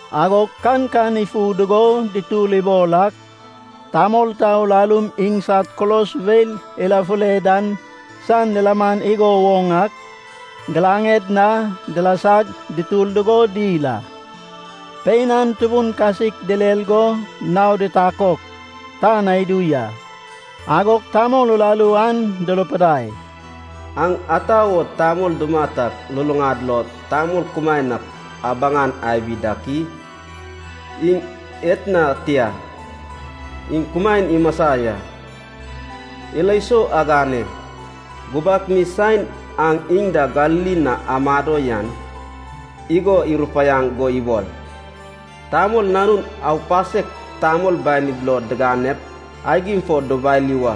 Agog kankan ifu dugo dutur ibol ak, tamol ta urarum, iŋsad kulos weil irafule dan san lilaman igo woŋ ak, giraŋed na dilasag dutur dugo dil a. Pein an tubun kasik direr go naod itakok tan na idu ya. Agog tamol uraru an durupidai, “Aŋ ata wo tamol dumat ak luluŋad lo tamol kumaen ak abaŋan abi dak i?” Iŋ etna tia. Iŋ kumaen imasa ya. Ilo sou agane, gubak mi saen aŋ iŋ da Galili na amado yan igo irupaiaŋ go ibol, “Tamol Nanun aupasek tamol banid lo diganep, aigim fo dubali wa.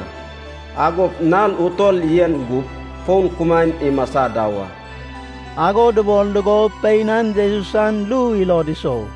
Agop nal utol yen gup, fon kumaen imasa da wa.” Ago dubol dugo pein an Jesus san ru ilod isou.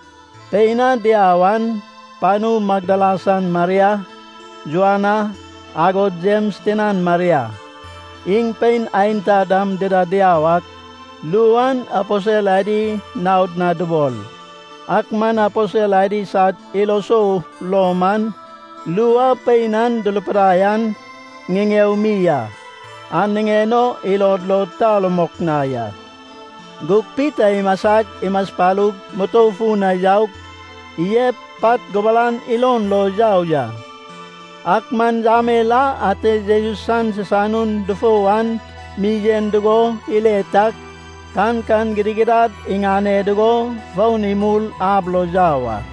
Pein a diau an: panu Magdala san Maria, Joana, agod Jems tinan Maria. Iŋ pein aenta dam dida diau ak ru an aposel adi naod na dubol. Ak man aposel adi sad ilo sou lo man, ru a pein an durupidai an ŋiŋeo mi a, an niŋen o ilod lo ta rumok na ya. Gug Pita imasag, imaspalug, mutou fun na yaug, iyep pat gubaran ilon lo yau ya. Ak man yamel a ate Jesus san sisanun dufou an mi yen dugo ile tag, kankan gidigidad iŋane dugo fon imul ab lo yau a.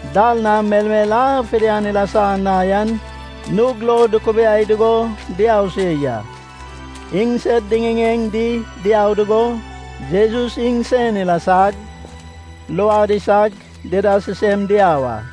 Dal na melmel a fidian ilasa na yan nug lo dukubiai dugo diau se ya. Iŋsed diŋiŋeŋ di diau dugo Jesus iŋsen ilasag, luad isag, dida sisem diau a.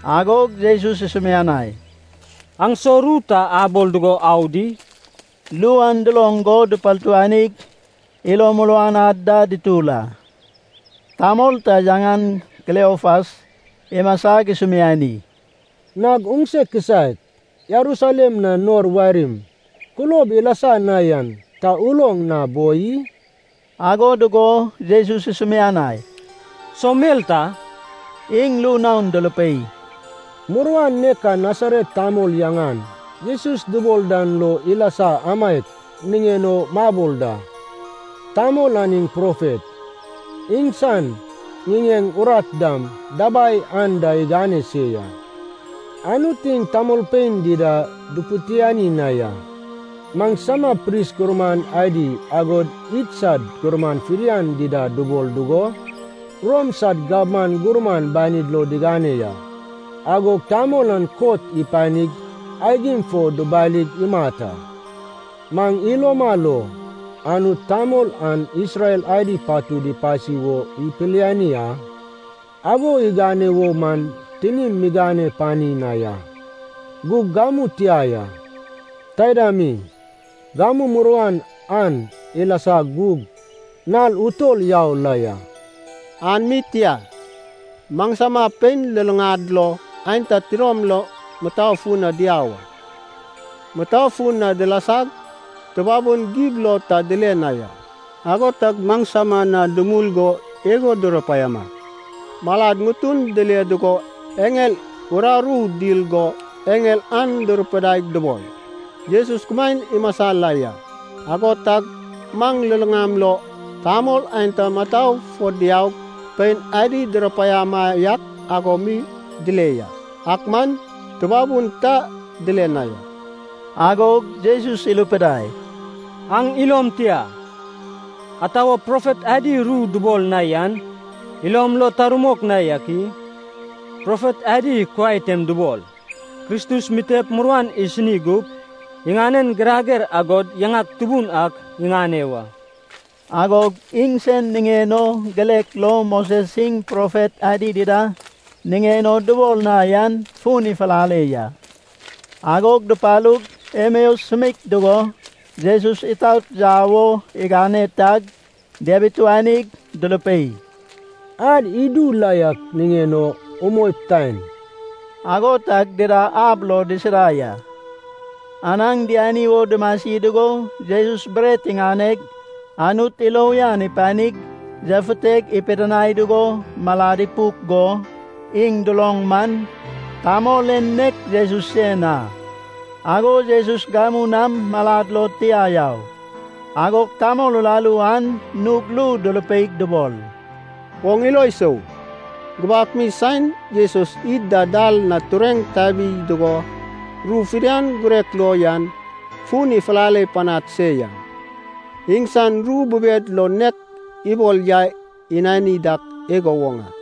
Agog Jesus isumianai, “Aŋ so ru ta abol dugo au di?” Ru an duloŋ go dupartuanig ilo muruan ad da dutur a. Tamol ta yaŋan Kleopas imasag isumiani, “Nag oŋse kisaek Jerusalem na nor warim kulob ilasa na yan ta uloŋ na boi i?” Ago dugo Jesus isumianai, “So mel ta?” Iŋ ru naon durupei, “Muruan nek a Nasaret tamol yaŋan Jesus dubol dan lo ilasa amaiak niŋen o mabol da. Tamol an iŋ profet. Iŋsan ŋiŋeŋ, urat dam dabai anda igane se ya. Anut, iŋ tamolpein dida dupitiani na ya. Maŋsama pris gurman adi agod idsad gurman fidian dida dubol dugo, Rom san gabman gurman banin lo digane ya. Agog tamol an kot ipanig aigim fo dubalig imat a. Maŋ iloma lo, Anut tamol an Isrel adi patud ipasi wo ipiliani a. Ago igane wo maŋ tinim migane pani na ya, gug gamu tia ya. Taida mi, gamu muruan an ilasa gug nal utol yau la ya. An mi tia, maŋsama pein luluŋad lo aenta tidom lom mutou fun na diau a. Mutou fun na dilasag tubabun gib lo ta dile na ya. Ago tag maŋsama na dumul go igo durupaiama, malad ŋutun dile dugo eŋel uraru dil go eŋel an durupidaig dubol, ‘Jesus kumaen imasa la ya.’ Ago tag maŋ luluŋam lo tamol aenta mutou fo diaug pein adi durupaiama yak ago mi dile ya. Ak man tubabun ta dile na ya.” Agog Jesus irupidai, “Aŋ ilom tia. Ata wo profet adi ru dubol na yan ilom lo ta rumok na yak i? Profet adi kuai tem dubol, Kristus mitep muruan isini gup, iŋanen girager agod yaŋan tubun ak iŋane wa.” Agog iŋsen niŋen o girek lo Moses iŋ profet adi dida niŋen o dubol na yan fun ifulale ya. Agog dupalug, Emeas sumeik dugo, Jesus itaot yau wo igane tag diabituanig durupei, “Ad idu la yak niŋen o umoip, taen.” Ago tag dida ab lo disida ya. Anaŋ diani wo dumasi dugo Jesus bret iŋaneg, Anut ilo uyan ipanig, yafuteg, ipidinai dugo malad ipuk go iŋ duloŋ man, tamol en nek Jesus sen a. Agog Jesus gamu nam malad lo tia yau. Agog tamol uraru an nug ru durupeig dubol, “Oŋ ilo isou, gubak mi saen Jesus id da dal na tureŋ tabi dugo ru fidian girek lo yan fun ifulale panad se yan, iŋsan ru bubed lo nek ibol yai inani dak igo woŋ a.”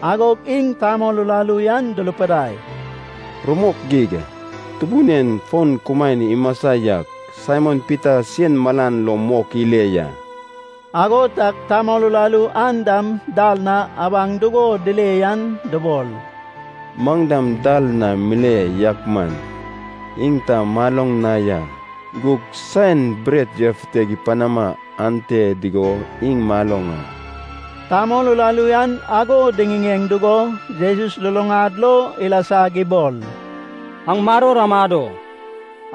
Agog iŋ tamol uraru an durupidai, “Rumok geig. Tubun en fon kumaen imasa ya! Saimon Pita sen malan lo mok ile ya.” Ago tag tamol uraru an dam dal na abaŋ dugo dile yan dubol, “Maŋ dam dal na mile yak man iŋ ta maloŋ na ya. Gug saen bret yafuteg ipanama ante dugo iŋ maloŋ a.” Tamol uraru an ago diŋiŋeŋ dugo Jesus luluŋad lo ilasag ibol, “Aŋ maror amado.”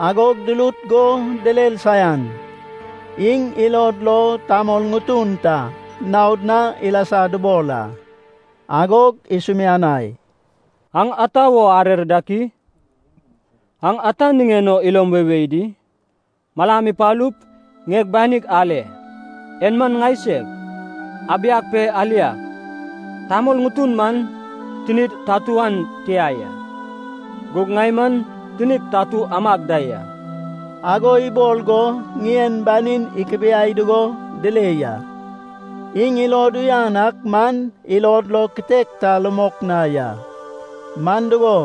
Agog durut go direr saian. Iŋ ilod lo tamol ŋutun ta naod na ilasa dubol a. Agog isumianai, “Aŋ ata wo arer dak i? Aŋ ata niŋen o ilom weiwei di? Malam ipalup, ŋieg banig ale. En man ŋaiseg. Abiag pe aliag! Tamol ŋutun man tinid tatu an tia ya. Gug ŋai man tinig tatu amag da ya.” Ago ibol go ŋien banin ikibiai dugo dile ya. Iŋ ilod uyan ak man ilod lo kitek ta rumok na ya. Man dugo,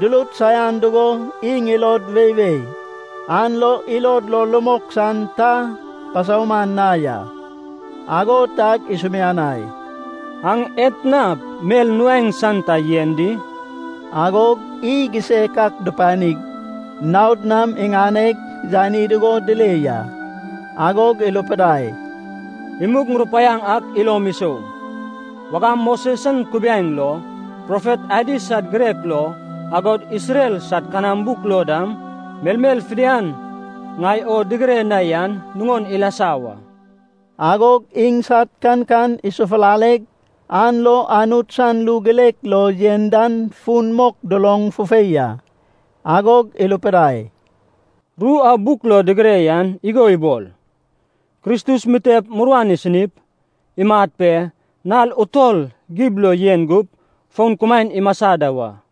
durut saian dugo iŋ ilod weiwei, an lo ilod lo rumok san ta pasauman na ya. Ago tag isumianai, “Aŋ etna mel nuaeŋ san ta yen di?” Agog iy gisek ak dupanig, naod nam iŋaneg yani dugo dile ya. Agog irupidai, “Imug ŋurupaiaŋ ak ilom isou. Wagam Moses san kubiaeŋ lo, profet adi sad girek lo, agod Isrel sad kanam buk lo dam, melmel fidian ŋai o digire na yan nuŋon ilasa wa.” Agog iŋsad kankan isofulaleg, an lo Anut san ru girek lo yen dan fun mok duloŋ fufei a. Agog irupidai, “Ru a buk lo digire yan igo ibol: Kristus mitep muruan isinip, imat pe, nal utol gib lo yen gup, fon kumaen imasa da wa.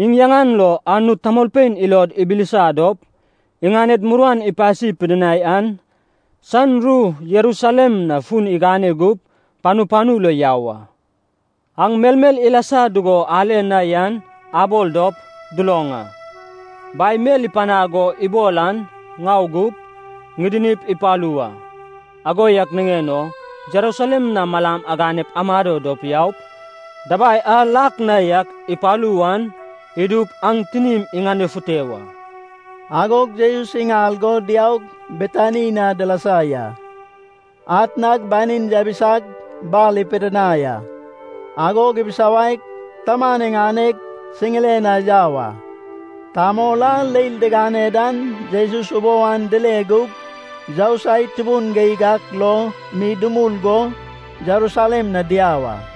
Iŋ yaŋan lo Anut tamolpein ilod ibilisa dop, iŋaned muruan ipasi pidinai an san ru, Jerusalem na fun igane gup, panu panu lo yau a. Aŋ melmel ilasa dugo ale na yan abol dop, duloŋ a. Bai mel ipanaŋ o ibol an ŋau gup, ŋidinip ipalu wa. Ago yak niŋen o Jerusalem na malam aganep amado dop yaup, dabai a lak na yak ipalu wan idup aŋ tinim iŋanefute wa.” Agog Jesus iŋal go diaug, Betani na dilasa ya. Atnag banin yabisag, bar ipidinai a. Agog ibisawaig, Taman iŋaneg siŋiren na yau a. Tamol a leil digane dan Jesus ubou an dile gug yousai tubun geig ak lo mi dumul go Jerusalem na diau a.